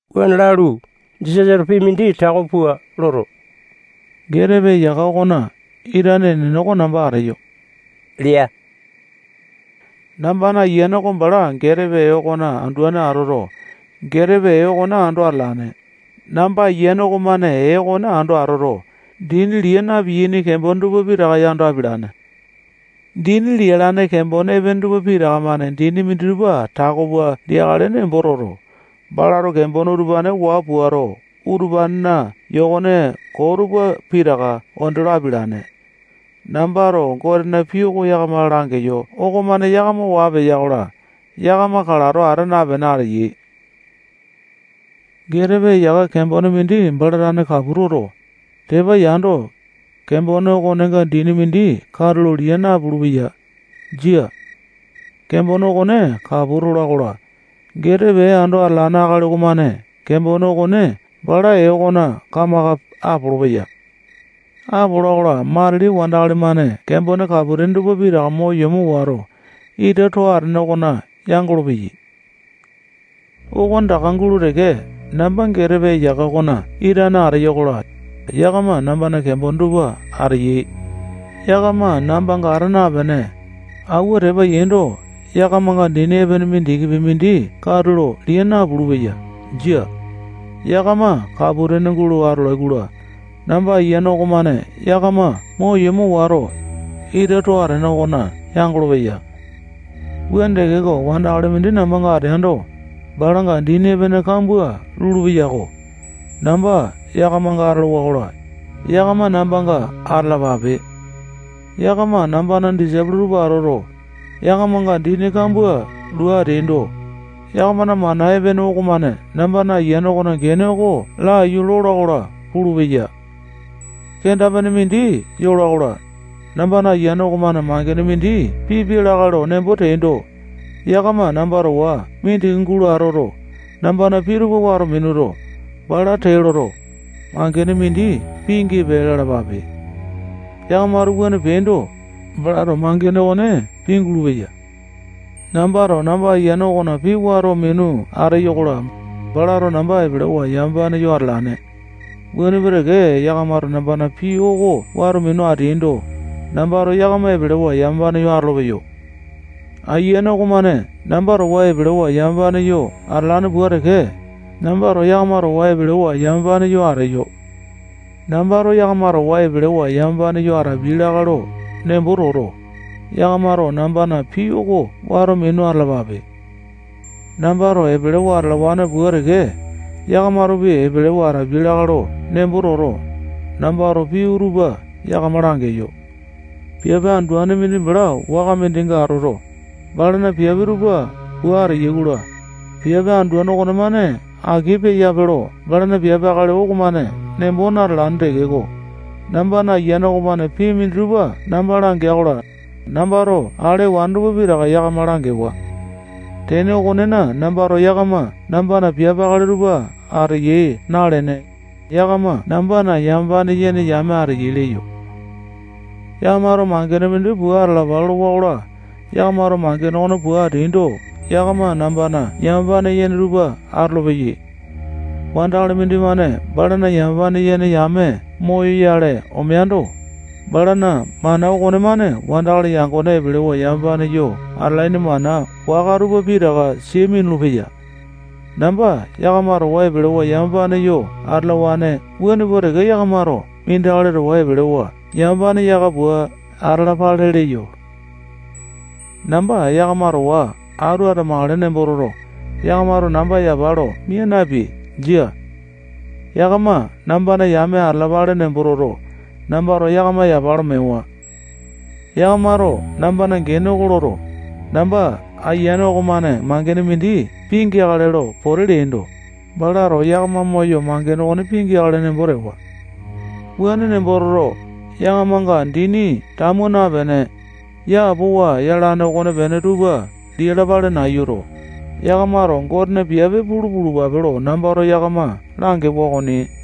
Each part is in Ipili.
Wuane lalu, Jisasato pii mindi tako pua loto, getepe eyaka okona itane enene oko namba ateyo lea. Nambana Ayiane oko bala getepe ee okona anduane atoto, getepe ee okone ando atalane. Namba Ayiane okomane ee okone ando atoto, dini lia na-piyaini kembone tupa pitaka yando apialane. Dini lialane kembone epene tupa pitaka-mane dini minditupa tako pua liakale nembo toto, balato kembone utupane waa puato, utupanena yokone koo tupa pitaka onde lo apialane. Nambato Gotena pii oko yakama langeyo okomane yakama waa peya-kola, yakama kalato ata napene ateyai. Getepe eyaka kembone mindi bala tane kapu toto, tepa yando, kembone okonenga dini mindi katulo lia napulu-peya. Jia. Kembone okone kapu tola-kola, getepe ee ando atalane akali okomane kembone okone balana ee okona kamaka apolopeya. Apola-kola, matili wandakali-mane kembone kapu-tene tupa pitaka mo yomo wato, ita too atene okona yangolo-peyai. Okone taka gulo teke, namba getepe eyaka okona itane ateyo-kola, yakama nambana kembone tupa ateyai. Yakama nambanga ata napene, awua tepa yaindo, yakamanga dini epene mindikipi mindi katulo lia napulu-peya. Jia. Yakama kapu-tene gulo atolai-kola, namba Ayiane okomane yakama mo yomo wato, ita too atene okona yangolo-peya. Wuane tekeko, wandakali mindi nambanga ateando, balanga dini epene kambua lulupeya-ko. Namba yakamanga atolowa-kola, yakama nambanga atalapape. Yakama nambana disaipolo tupa atoto, yakamanga dini kambua lua ateaindo, yakamana mana epene okomane namba Ayiane okona gene oko laiyu lola-kola pulupeya. Kenda-pene mindi yola-kola, nambana Ayiane okomane mangene mindi pipia lakae lo nembo teaindo, yakama namba towa mindiki gulo atoto, nambana pii tupa wato minuto, bala tee loto, mangene mindi pingipe lalapape. Yakamato wuane peaindo, balato mangene okone pingulu-peya. Nambato namba Ayiane okona pii wato minu ateyo-kola, balato namba epelewa yamapane yo atalane. Wuane pua teke, yakamato nambana pii oko wato minu ateaindo, nambato yakama epelewa yamapane yo atolopeyo. Ayiane okomane namba towa epelewa yamapane yo atalane pua teke, nambato yakama towa epelewa yamapane yo ateyo. Nambato yakama towa epelewa yamapane yo atapiai lakae lo nembo toto, yakamato nambana pii oko wato minu atalapape. Nambato epelewa atalawane pua teke, yakamatopi epelewa atapiai lakae lo nembo toto, nambato pii utupa yakama langeyo. Piape anduane mindi bala waka mindinga atoto, balana piape tupa pua ateya-kola, piape anduane okonemane aki peyape lo balana piape akali okomane nembo natalane tekeko, nambana Ayiane okomane pii minditupa namba langea-kola, nambato ale ewane tupa pitaka yakama langewa. Tene okonena, nambato yakama nambana piape akali tupa ateyai nalene, yakama nambana yamapane yene yame ateyai leyo. Yakamato mangene mindi pua atalapa lolowa-kola, yakamato mangene okone pua ateaindo, yakama nambana yamapane yene tupa atolopeyai. Wandakali mindimane balana yamapane yene yame moyoyale omeando, balana mana okonemane wandakali yangone epelewa yamapane yo atalaini mana waka tupa pitaka sia minulu-peya. Namba yakama towa epelewa yamapane yo atalawane wuane pua teke yakamato mindi akali towa epelewa yamapane yaka pua atalapale leyo. Namba yakama towa atu atamakale nembo toto, yakamato namba yapa lo mia napeai. Jia. Yakama nambana yame atalapale nembo toto, nambato yakama yapa lo mewa. Yakamato nambana gene oko loto, namba Ayiane okomane mangene mindi pingeakale lo pote leaindo, balato yakama moyo, mangene okone pingeakale nembo tewa. Wuane nembo toto, yakamanga dini tamu napene, yapowa yalane okonepene tupa lialapale nayuto, yakamato Gotena piape pulu pulupape lo nambato yakama langewa okoni.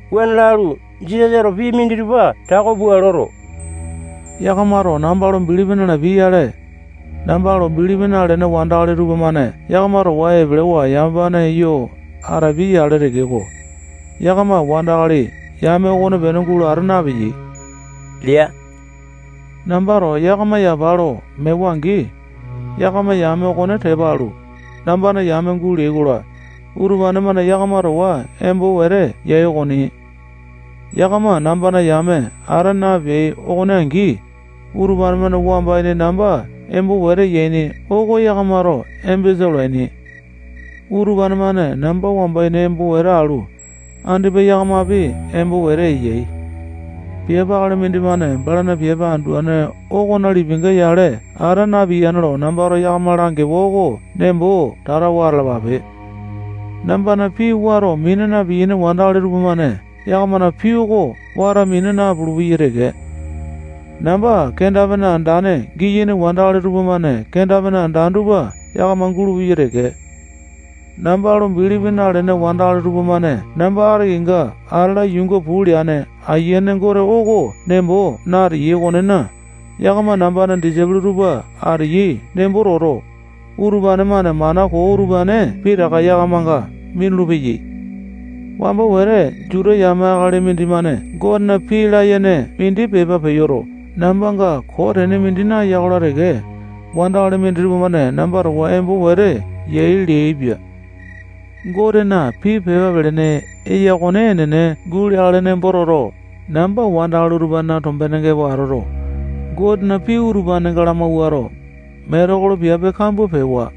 Wuane lalu, Jisasato pii minditupa tako pua loto, yakamato namba lo bilipi nalapiai-yale, namba lo bilipi nalene wandakali tupamane yakama towa epelewa yamapane yo atapiai-yale tekeko, yakama wandakali yame okonepene gulo ata napeyai lea. Nambato yakama yapa lo mewa-angi, yakama yame okone tepa alu, nambana yame guleai-kola, utupane-mane yakama towa embo wete yai okoni. Yakama nambana yame ata napeai okone angi, utupane-mane wamba ini namba embo wete yaini oko yakamato embesa olaini. Utupane-mane namba wamba ini embo wete alu, andipa yakamapi embo wete eyai. Piape akali mindimane balana piape anduane okona lipinga yale ata napiyane lo nambato yakama langewa oko nembo tatawa atalapape. Nambana pii wato mina na-piyaini wandakali tupamane yakamana pii oko wato mina napulu-peyai teke. Namba kenda-pene andane giyaini wandakali tupamane kenda-pene andane tupa yakama gulupeyai teke. Namba lo bilipi nalene wandakali tupamane namba ati kenga atala yuunga puu leane Ayiane Gote oko nembo nateyai okonena, yakama nambana disaipolo tupa ateyai nembo toto, utupane-mane mana koo utupane pitaka yakamanga minulu-peyai. Wamba wete Juta yame akali mindimane Gotena pii layene mindi pepa peyoto, nambanga koo tene mindi naya-kola teke, wandakali minditupa-mane namba towa embo wete yai leaipia. Gotena pii pepa pelene eya okone enene guleakale nembo toto, namba wandakali utupanena tombenenga epo atoto, Gotena pii utupanenga lamawuato, metekolo piape kambua pewa.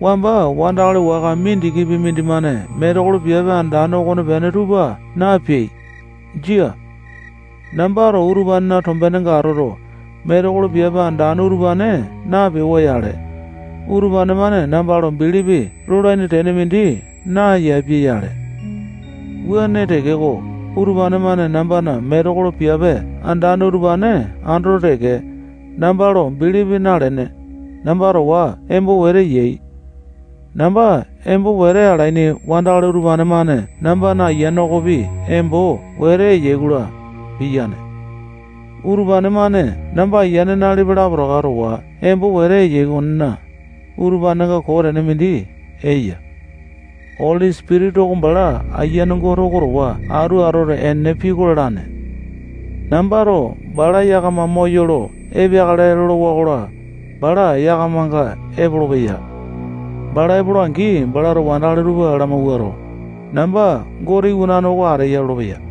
Wamba wandakali waka mindikipi mindimane metekolo piape andane okonepene tupa napeai. Jia. Nambato utupanena tombenenga atoto, metekolo piape andane utupane napewa-yale, utupane-mane namba lo bilipi lolane tene mindi nayapia-yale. Wuane tekeko, utupane-mane nambana metekolo piape andane utupane andoto teke, namba lo bilipi nalene, namba towa embo wete yai. Namba embo wete alaini wandakali utupane-mane nambana Ayiane okopi embo wete eyai-kola, piyaini. Utupane-mane namba Ayiane nalipa lapotaka towa embo wete eyai okonena, utupanenga koo tene mindi eya. Oli Sipitisa oko bala Ayiane Gote oko towa atu atoto, enene pii oko lalane. Nambato bala yakama moyolo epeakale lolowa-kola, bala yakamanga epolopeya. Bala epola-angi, balato wandakali tupa lamawuato, namba Gote Iwanane oko ateya lolopeya.